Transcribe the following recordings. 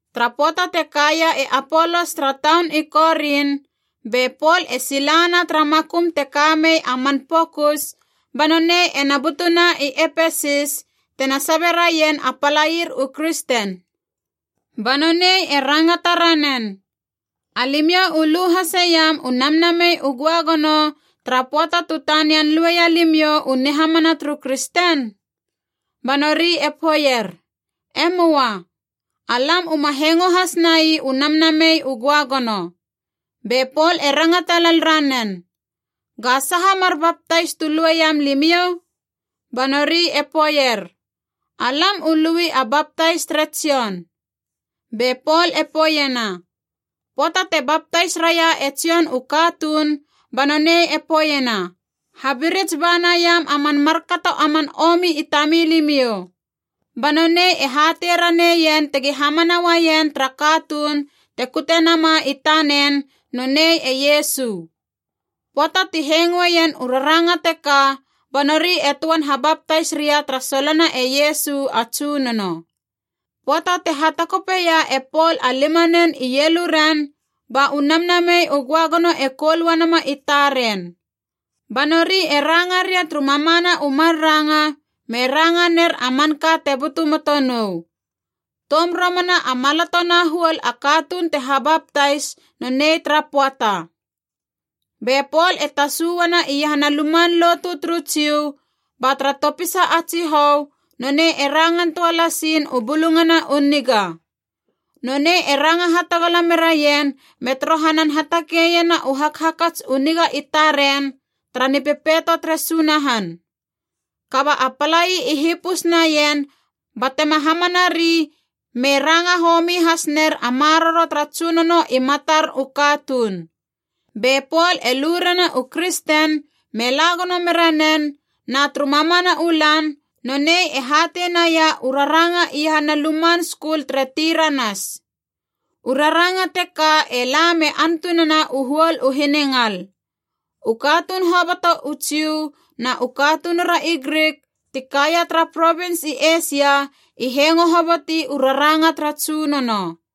Tara pöata te kaia e Apolos tara taun i Korin, be Pol e silana tara makum te ka mei a man pokus ba nonei ena butuna i Epesis, tena sabe raien a palair u kristen. Ba nonei e rangata ranen, “Alimiou u lu haseiam u Namnamei u Göagono tara pöata tu tanian lueia limiou u nihamana turu kristen?” Ba nori e poeier, “E möa. Alam uma hengo has nai u Namnamei u Göagono.” Be Pol e rangata lel ranen, “Ga saha mar baptais tu lueiam limiou?” Ba nori e poeier, “Alam u lui a baptais tere Jon.” Be Pol e poeiena, “Pöata te baptais raia e Jon u katuun ba nonei e poeiena, ‘Habirits ba naiam a man markato a man omi i tamilimiou.’ Ba nonei e hatei raneien tegi hamana uaien tara katuun te kute nama i tanen, nonei e Iesu.” Pöata ti hengoeien u raranga teka ba nori e töan habaptais ria tara solona e Iesu a Tsunono. Pöata te hatakopeia e Pol a limanen ieluren, ba u Namnamei u Göagono e koul uanama i taren. Ba nori e ranga ria turu mamana u mar ranga, me ranga ner a manka te butu moto nou. Toum romana a maloto na huol a katuun te habaptais nonei tara pöata. Be Pol e tasu uana iahana luman lotu turu Jiu, ba tara topisa a tsihou, nonei e rangan töa lasiin u Bulungana u Niga. Nonei e ranga hatagala meraien me torohanan hatakeiena u hakhakats u niga i taren tara Nipepeito tere Sunahan. Kaba a palai i hipus naien batema hamanari me ranga homi hasner a Maroro tara Tsunono i matar u katuun. Be Pol e lurena u kristen me la gono mera nen, na turu mamana u lan nonei e hatei naia u raranga iahana luman skul tere Tiranas. U raranga teka e la me antunena u huol u hiningal. U katuun hoboto u Jiu na u katunura i Grik ti kaia tara provins i Eisia i hengo hoboti u raranga tara Tsunono.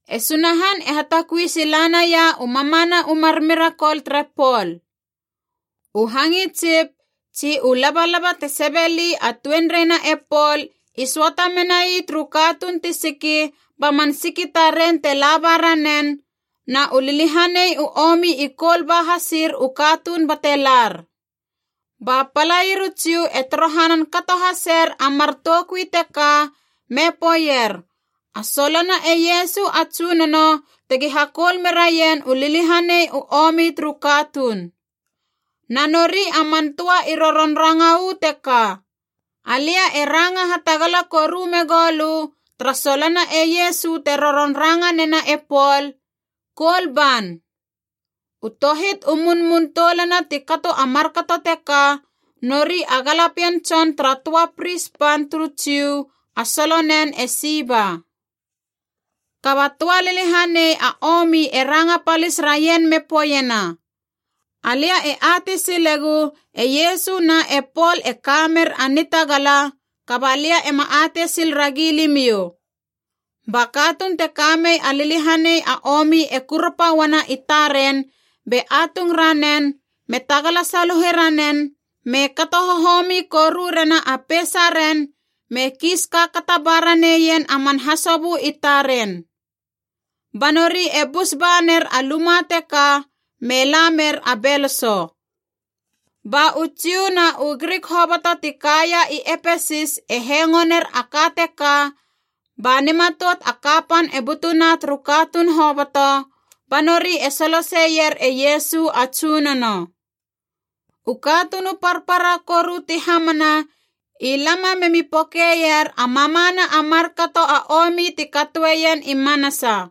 E Sunahan e hatakui sila naia u mamana u mar mirakol tere Pol. U hangitsip tsi u labalaba te sebeli a tuenreina e Pol i söata menai turu katuun ti siki ba man siki taren te laba ranen, na u liliahanei u omi i koul ba hasir u katuun bate lar. Ba palair u Jiu e torohanan kato haser a mar toukui teka me poeier a solona e Iesu a Tsunono tegi hakoul meraien u liliahanei u omi turu katuun. Na nori a man töa i roron ranga u teka, “Alia e ranga hatagala koru megou lö tara solona e Iesu te roron ranga nena e Pol, koul ban!” U tohit u munmun toulana ti kato a markato teka nori a galapien tson tara töa pris pan turu Jiu a solonen e Siva. Kaba töa liliahanei a omi e ranga palis raien me poeiena, “Alia e atei silegu e Iesu na e Pol e ka mer a nitagala, kaba lia ema atei sil ragi limiou!” Ba katuun te ka mei a liliahanei a omi e kurapa uana i taren be atung ranen me tagala saluhe ranen me kato hohomi koru rena a peisaren me kiis kaakata ba raneien a man hasobö i taren. Ba nori e bus ba ner a luma teka me la mer a beloso. Ba u Jiu na u Grik hoboto ti kaia i Epesis e hengo ner a ka teka, ba nimatout a kapan e butuna turu katuun hoboto, ba nori e soloseier e Iesu a Tsunono. U katuun u parpara koru ti hamana i lama memi pokeier a mamana a markato a omi ti katoeien i manasa.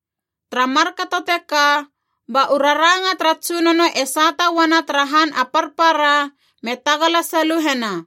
Tara markato teka, ba u raranga tara Tsunono e sata uana tara han a parpara me tagala saluhena.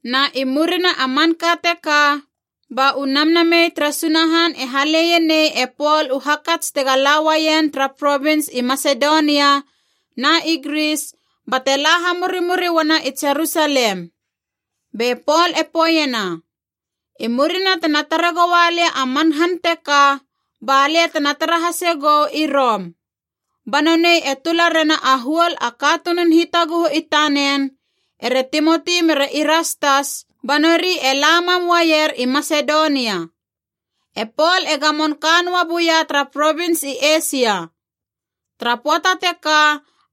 Na i murina a manka teka, ba u Namnamei tere Sunahan e haleie nei e Pol u hakats tega la uaien tara provins i Masedonia na i Gris, bate la hamurimuri uana i Jerusalem. Be Pol e poeiena, “I murina tena tare goua lia a man han teka, balia tena tara hase gou i Rom.” Ba nonei e tula rena a huol a katunun hitaguhu i tanen, ere Timoti mere Irastas, ba nori e la mam uaier i Masedonia. E Pol e gamon ka noa buia tara provins i Eisia. Tara pöata teka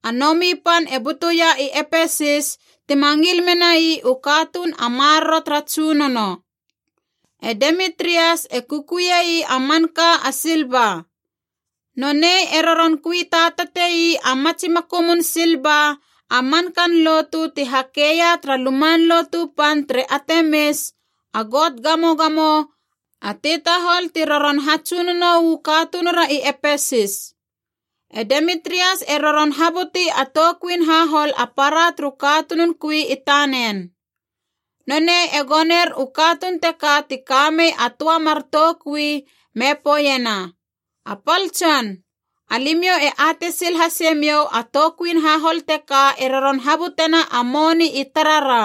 a nomi pan e butuia i Epesis tima ngil menai u katuun a Maroro tara Tsunono. E Demitrias e kukuiei a manka a silva. Nonei e roron kui tatateie a matsi makumun silva a mankan lotu ti hakeia tara luman lotu pan tere Atemis, a got gamogamo a tetahol ti roron hatsunono uu katunura i Epesis. E Demitrias e roron habuti a toukuin hahol a para turu katunun kui i tanen. Nonei e goner u katuun teka ti kamei a töa mar toukui me poeiena, “A pal tson, alimiou e atei sil hasemiou a toukuin hahol teka e roron habutena a moni i tarara.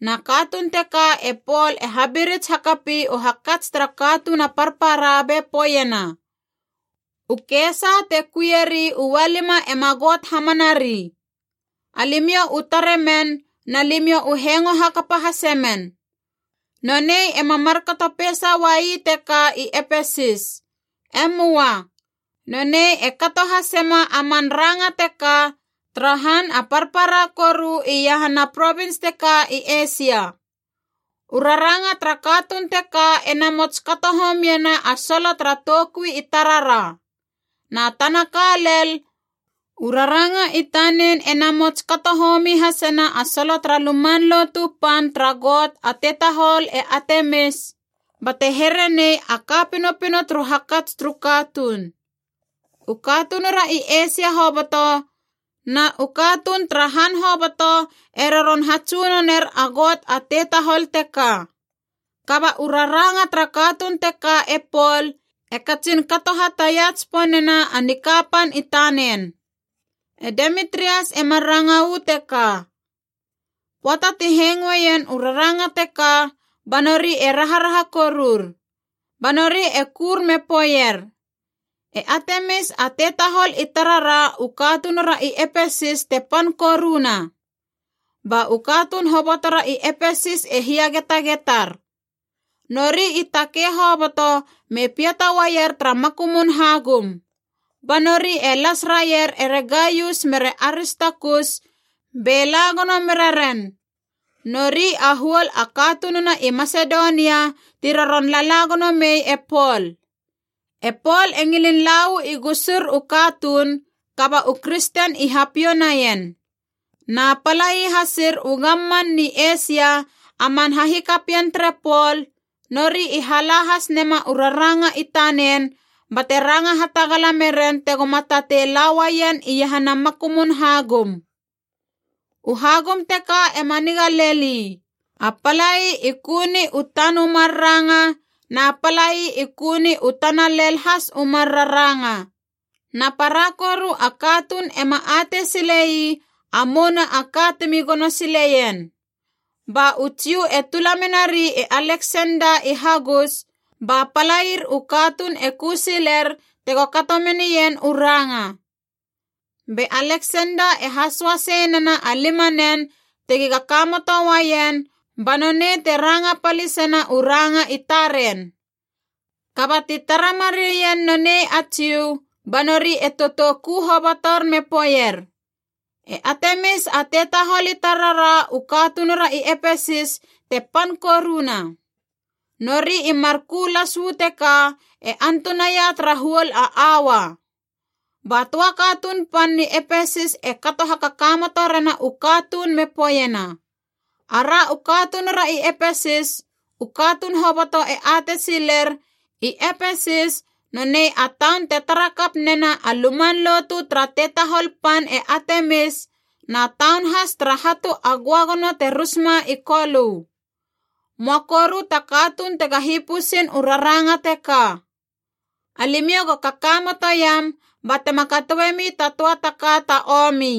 Na katuun teka e Pol e habirits hakapi u hakats tara katuun a parpara be poeiena, ‘U kesa te kuieri ualima ema got hamanari.’ Alimiou u tare men na limiou u hengo hakapa hase men. Nonei ema markato peisa uai teka i Epesis. E möa. Nonei e kato hasema a man ranga teka tara han a parpara koru iahana provins teka i Eisia. U raranga tara katuun teka e namots kato homiena a solo tara toukui i tarara. Na tana ka lel, u raranga i tanen e namots kato homi hasena a solo tara luman lotu pan tara got a tetahol e Atemis, bate here nei a ka pinopino turu hakats turu katuun. U katunura i Eisia hoboto na u katuun tara han hoboto e roron hatsunoner a got a tetahol teka. Kaba u raranga tara katuun teka e Pol, e katsin kato hataia tsiponena a nikapan i tanen.” E Demitrias e mar ranga uu teka. Pöata ti hengoeien u raranga teka ba nori e raharaha korur. Ba nori e kur me poeier, “E Atemis a tetahol i tarara u katunura i Epesis te pan koruna!” Ba u katuun hobotora i Epesis e hiagetagetar. Nori i takei hoboto me piata uaier tara makumun hagum. Ba nori e las raier ere Gaius mere Aristakus be la gono mera ren. Nori a huol a katununa i Masedonia ti roron lala gono mei e Pol. E Pol e ngilin la uu i gusur u katuun, kaba u kristen i hapiou naien. Na palai hasir u gamman ni Eisia a man hahikapien tere Pol, nori i hala has nema u raranga i tanen bate ranga hatagala meren tegoma tatei la uaien iahana makumun hagum. U hagum teka ema niga lel ii, a palai i ku ni u tan u mar ranga, na palai i ku ni u tana lel has u mar raranga. Na para koru a katuun ema atei sile ii a mouna a ka timi gono sileien. Ba u Jiu e tula menari e Aleksenda i hagus, ba palair u katuun e ku siler tego kato menien u ranga. Be Aleksenda e hasoasei nena a limanen tegi kakamoto uaien ba nonei te ranga palisena u ranga i taren. Kaba ti tara mareien nonei a Jiu, ba nori e totou ku hobotor me poeier, “E Atemis a tetahol i tarara u katunura i Epesis te pan koruna!” Nori i mar ku las uu teka e antunaia tara huol a aua. Ba töa katuun pan ni Epesis e kato hakakamoto rena u katuun me poeiena, “Ara u katunura i Epesis, u katuun hoboto e atei siler i Epesis nonei a taun te tara kap nena a luman lotu tara tetahol pan e Atemis, na taun has tara hatu a göagono te rusma i Kolö. Möa koru ta katuun tega hipusin u raranga teka. Alimiou go kakamotoiam ba tema katoemi ta töa ta ka ta omi.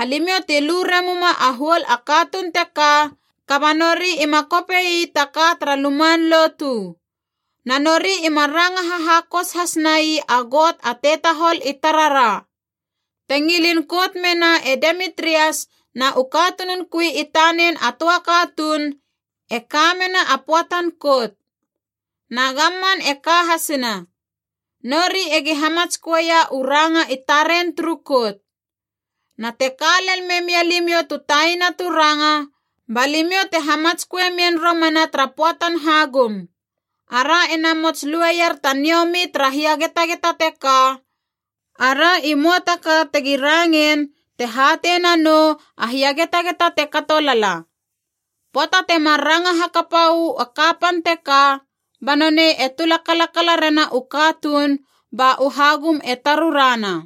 Alimiou ti lu remuma a huol a katuun teka, kaba nori ima kope ii ta ka tara luman lotu. Na nori ima ranga hahakos has nai a got a tetahol i tarara. Te ngilin kout mena e Demitrias na u katunun kui i tanen a töa katuun, e ka mena a pöatan kout. Na gamman e ka hasina. Nori egi hamatsköeia u ranga i taren turu kout. Na te ka lel memia limiou tu taina tu ranga, ba limiou te hamatsköe mien romana tara pöatan hagum. Ara ena mots lueier ta niomi tara hiagetageta teka, ara i möa ta ka tegi rangein te hatei nanou a hiagetageta te kato lala.” Pöata temar ranga hakapa uu a kapan teka, ba nonei e tula kalakala rena u katuun ba u hagum e tarurana.